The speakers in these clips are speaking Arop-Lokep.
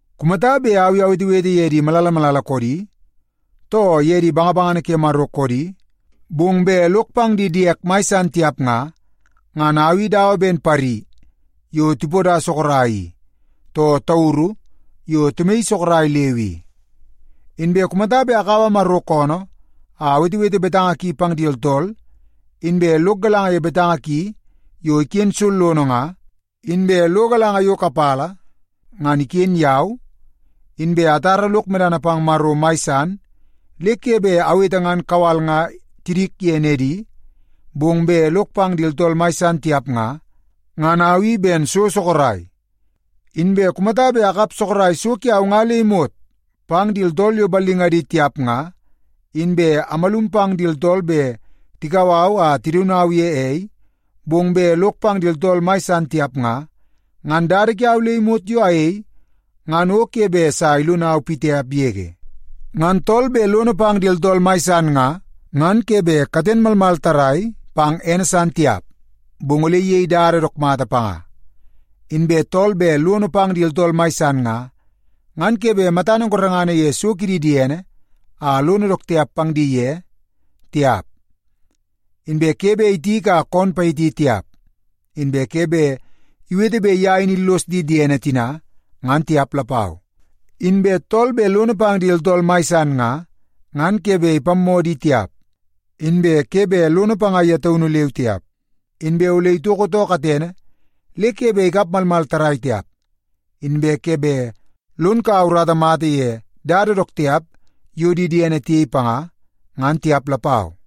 Kumata bet au i awetewete ye di malala malala koodi, too ye di bangabangana ke Maro koodi, bong bet lok pang di diek mai san tiap nga, ngan au i dawa ben pari yo tipoda sorok i, too tauru yo timaii sorok leu i. Inbe kumata bet akaua Maro koonoo a awetewete betanga ki pang di tooltool, inbe lok galanga ye betanga ki yo iken sollono nga, inbe lo galanga yo kapala ngan iken yau, inbe atara lok medana pang Maro mai san le ke bet awete ngan kawal nga tidik ye nedi, bong bet lok pang di tooltool mai san tiap nga, ngan au i ben so sorok. Inbe kumata bet akap sorok so kiau nga le imot pang di tooltool yo ballingadi tiap nga, inbe amalum pang di tooltool bet tikau au a tidaun au ye ei, bong bet lok pang di tooltool mai san tiap nga, ngan dada kiau le imot yo ayei ngan o ke bet sa ilonau pitiap yege. Ngan tool bet lono pang di tooltool mai san nga, ngan ke bet katene malmal tarrai pang ene san tiap, bong ole iyei dada dook mata panga. Inbe tool bet lono pang di tooltool mai san nga, ngan ke bet matana gorengana ye so kidi diene a lono dook tiap pang di tiap, inbe ke bet itiki a koon payiti tiap, inbe ke bet iwete bet ye in illos di diene tina, ngan tiap lapau. Inbe tool bet lono pang di tooltool mai san nga, ngan ke bet ipammoo di tiap, inbe ke bet lono panga ye taunu leu tiap, inbe ole itoko too katene le ke bet ikap malmal tarrai tiap, inbe ke bet lon kaua urata mata ye dada dook tiap yo di diene tiyei panga, ngan tiap lapau.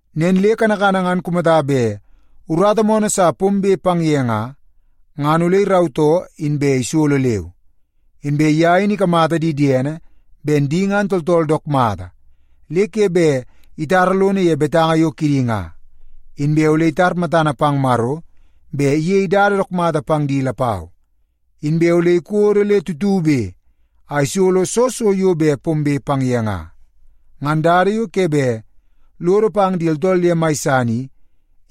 Nen le kanakana ngan kumata bet urata moonoo sa pombe pang ye nga, ngan ole irautoo inbe isolo leu. Inbe ye in ikamata di diene ben di ngan tooltool dook mata le ke bet itara lono ye betanga yo kidi nga, inbe ole itar matana pang Maro bet iyei dada dook mata pang di lapau. Inbe ole ikodo le tutube a isolo soo so yo bet pombe pang ye nga. Ngan dada yo ke bet lodo pang di tooltool ye mai san i,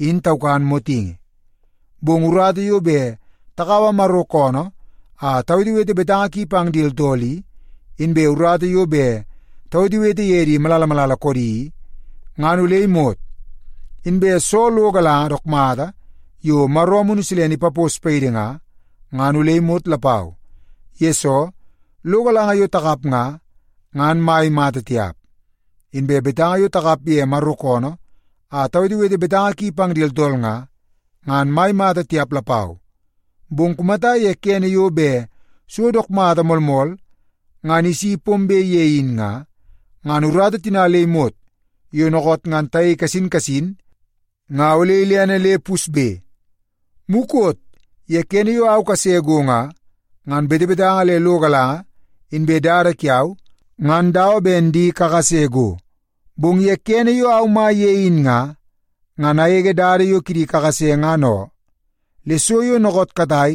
in taukan motingi. Bong urata yo bet takaua Maro koonoo a tawetewete betanga ki pang di tooltool i, inbe urata yo bet tawetewete ye di malala malala koodi i, ngan ole imot. Inbe soo lo galanga dook mata yo Maro Amunu Silene ipapos paidi nga, ngan ole imot lapau. Yesoo, lo galanga yo takap nga, ngan mai mata tiap. Inbe betanga yo takap ye Maro koonoo a tawetewete betanga ki pang di tooltool nga, ngan mai mata tiap lapau. Bong kumata ye kene yo bet so dook mata moolmool ngan isi pombe ye in nga, ngan urata tina le imot yo dookoot ngan tayei kasin kasin nga ole ilene le pusbe. Mukot ye kene yo au kase go nga, ngan betebetanga le lo galanga inbe dada kiau ngan dawa ben di kakase go. Bong ye kene yo au mai ye in nga, ngan agege dada yo kidi kakase ngan oo. Le so yo dookoot katai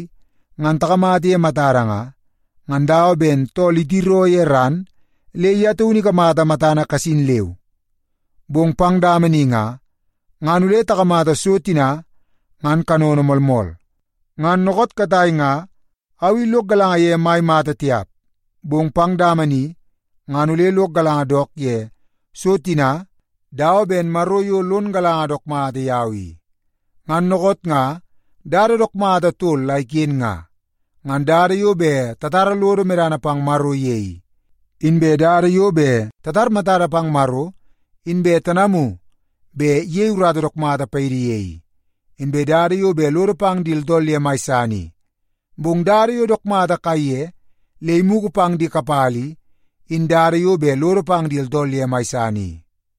ngan takamata ye matada nga, ngan dawa ben tool itiroo ye ran le ye taunu ikamata matana kasin leu. Bong pang dama ni nga, ngan ole takamata so tina ngan kanono moolmool. Ngan dookoot katai nga au i lok galanga ye mai mata tiap, bong pang dama ni ngan ole lok galanga dook ye so tina dawa ben Maro yo lon galanga dook mata yau i. Ngan dookoot nga dada dook mata tol la iken nga; ngan dada yo bet tatara lodo medana pang Maro ye i, inbe dada yo bet tatar matada pang Maro inbe tanamu bet iyei urata dook mata paidi ye i, inbe dada yo bet lodo pang di tooltool ye mai san i. Bong dada yo dook mata kaiye le imugu pang di kapala i, in dada yo bet lodo pang di tooltool ye mai san i.